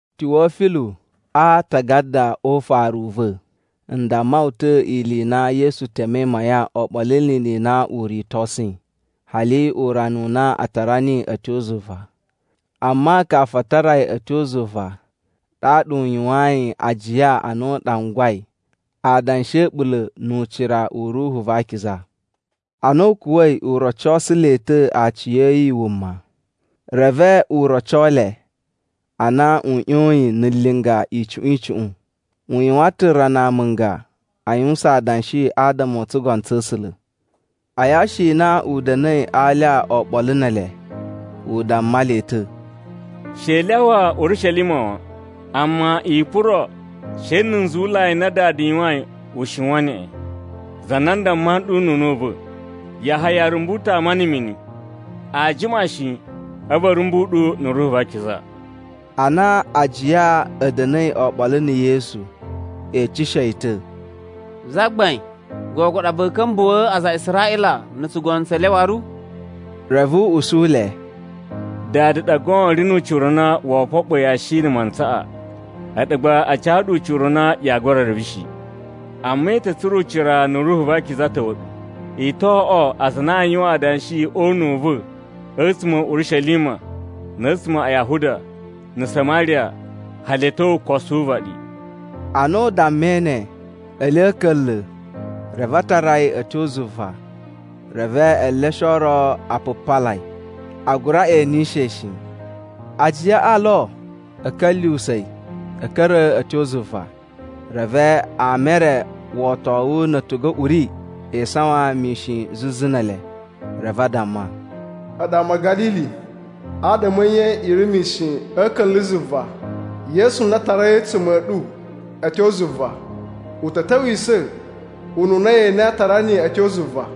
Tiwofilu, a aatagada o ufaru u va̱ n damma wu ta̱ ili i na Yesu temei mayan oɓolo ni ili i na u ritosuyi, hali urana u na a tara niyi a̱ tyo zuva. Amma kafu a tara yi a̱ tyo zuva ɗaɗa u yuwayin ajiya a na u ɗangwai adanshi a̱ a̱ɓula̱ nu ucira u Ruhu va Akiza. Ana u kuwa̱i, u rocosu le ta̱ aciya̱yi wuma, reve u roco le a na u ꞌyoyin na̱ linga icuꞌun icuꞌun. U yuwan ta̱ rana amunga a yuwusan adanshi adama o tsugono tsa̱ A̱sula̱. A yashi i na u da̱na̱i a alya oɓolo ne ele, u damma le ta̱, “She i lyawa Urishelima wan. Amma i puro she na̱ nzuwulai n na Dada yuwain u shiwan neꞌen, za na n damma nɗu nu una̱ u va̱, Yahaya rumbu ta̱ ama na̱ mini. Aa jima shi, a̱vu a̱ rumbu ɗu na̱ Ruhu va Akiza.” Ana ajiya a̱ da̱na̱i oɓolo na̱ Yesu, e eceshe yi ta̱, “Zagbain, gogo ɗa va̱a̱ ka̱mbuwa̱a̱ aza a Israꞌila na̱ tsugono tse le waru?” Reve u usu le, “Dada ɗa goon ri nu ucira u na woo foɓo yashi na̱ mantsaꞌa, a̱ɗu gba a ca ɗu ucira u na yaa gura reve shi. Amma i ta̱ tsura̱ ucira na̱ Ruhu va Akiza ta̱wa̱ ɗu. I to oꞌwo aza a na aa yuwan adanshi o una̱ u va̱ a̱tsuma̱ a̱ Urishelima na̱ a̱tsuma̱ a Yahuda, na̱ Samariya, hali a̱ tyo ukosu wu uvaɗi.” Ana u dammai ne, ele a̱ a̱ka̱nla̱, reve a tara yi a̱ tyo zuva. Reve eleshe o ro a pupala yi, a gura enishe yi shi. Ajiyaꞌa lo a̱ ka̱lyuwusa̱ yi a̱ ka̱ra̱ a̱ tyo zuva, reve ama e re wotowu na̱ a̱tugu a̱ uri e isawan mishin zuzu ne ele. Reve a damma, “A̱ɗu ama a̱ Ga̱lili, adama a̱ nye i ri mishin a̱ a̱ka̱nla̱ zuva? Yesu na a tarai a̱tsuma̱ a̱ ɗu a̱ tyo zuva, u ta̱ ta̱wisa̱ ununa ye enei a tara niyi a̱ tyo zuva.”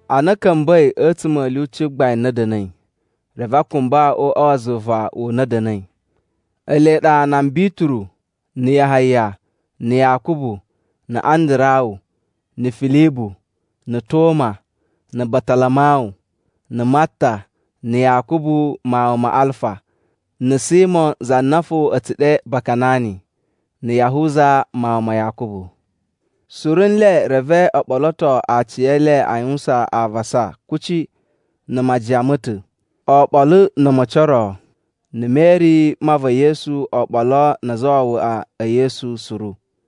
Ana a̱ ka̱mba̱i a̱tsuma̱ a̱ lyuci gbain na a̱ da̱na̱i, reve a kumba o uꞌwa wa zuva u na a̱ da̱na̱i, ele ɗa nan Bituru na̱ Yahaya na̱ Yakubu na̱ Andarawu na̱ Filibu na̱ Toma na̱ Batalamawu na̱ Matta na̱ Yakubu mawun ma Alfa na̱ Simo za na fo a̱ tsu ɗe Bakanani, na̱ Yahuza mawun ma Yakubu. Suru nle reve o ɓoloto aciyele a yuwusan avasa kuci na̱ majiyan ma̱ ta̱, oɓolo na̱ a̱ma̱ci o ro, na̱ Meri mma va̱ Yesu oɓolo na azawawaꞌa e Yesu suru.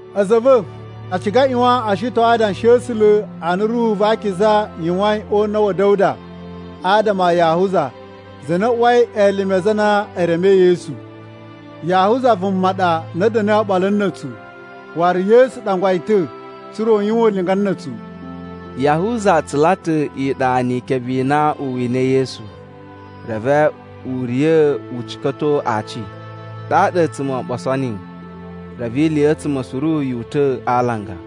“A̱za̱ a̱ va̱, a ciga a ꞌyuwan o shiton Adanshi a̱ A̱sula̱ a na Ruhu va Akiza yuwain o una̱ wa̱ Da̱wuda adama a Yahuza, za na uwai elime a aza a na e remei Yesu. Yahuza vuma ɗa na da̱na̱i oɓolo na̱ a̱tsu, waru Yesu ɗangwa yi ta̱ tsa̱ra̱ u yuwan ulinga na̱ a̱tsu.” (Yahuza tsula ta̱ iɗa ni ikebe i na u winai Yesu, reve u riya̱ u cika̱to aaci, ɗaɗa a̱a̱tsuma̱ o ɓoso niyi, reve iliya̱tsuma̱ suru yu uta̱ a alanga.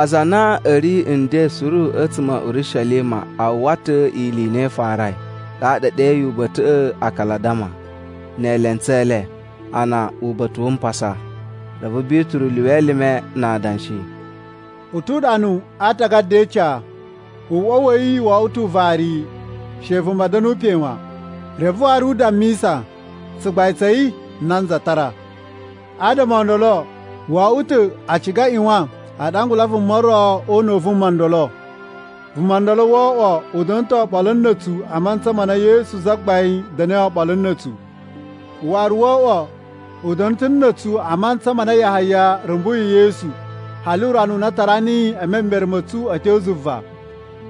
Aza a na a̱ ri nden suru a̱tsuma̱ a̱ Urishelima a uwwa ta̱ ili i na i farai, ɗaɗa e ɗeyi uba̱ta̱ꞌa̱ “Akaladama” ne elentsu e le, ana Uba̱ta̱ wu Mpasa.) Reve Bituru lyuwa elime na adanshi, “U tu uɗanu a Aatagada e Ica, ‘Uꞌwa wa̱ yi wo oꞌwo ta̱ uvariyi, she vuma da̱nu pe wan.’ Reve waru u dammisa, ‘Tsugbain tsa̱ yi nanza tara.’ “Adama o ndolo wo oꞌwo ta̱ a ciga a ꞌyuwan a ɗangula vuma ro o una̱ u vuma ndolo. Vuma ndolo o oꞌwo u da̱na̱ ta̱ oɓolo na̱ a̱tsu a mantsa ma na Yesu Zagbain da̱na̱i oɓolo na̱ a̱tsu. Waru wo oꞌwo u da̱na̱ ta̱ na̱ a̱tsu a mantsa ma na Yahaya rumbuyi Yesu, hali urana u na a tara niyi e memere ma̱ a̱tsu a̱ tyo zuva.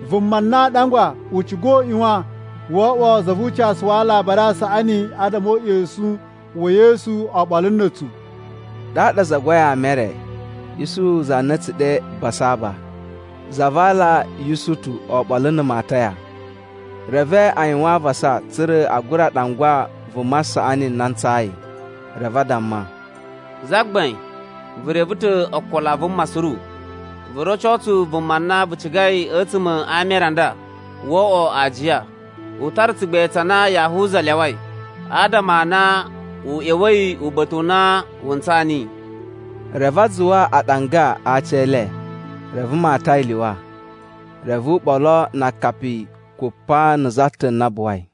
Vuma na aa ɗangwa u ciga u ꞌyuwan woo oꞌwo za vu ucasu wa Alabari a Saꞌani adama o uꞌyosun wa̱ Yesu oɓolo na̱ a̱tsu.” Ɗaɗa a zagwai ama e re: Isuhu za na a̱ tsu ɗe Basaba za va aala Yusutu oɓolo na̱ Mataya. Reve a yuwan avasa tsa̱ra̱ a gura ɗangwa vuma saꞌani na ntsayi. Reve a damma, “Zagbain, vu reve ta̱ ookolo a vuma suru, vu roco tsu vuma na vu cigai a̱tsuma̱ a ama e re a nda. Wo oꞌwo aajiya, u tara tsugbain tsa na Yahuza lyawai, adama a na u ꞌya̱wa̱i uba̱ta̱ u na wu ntsaa niyi.” Reve a zuwa aɗanga a aci e le, reve Mataya lyuwa, reve u ɓolo na akapi kupa na̱ za ta̱ na buwai.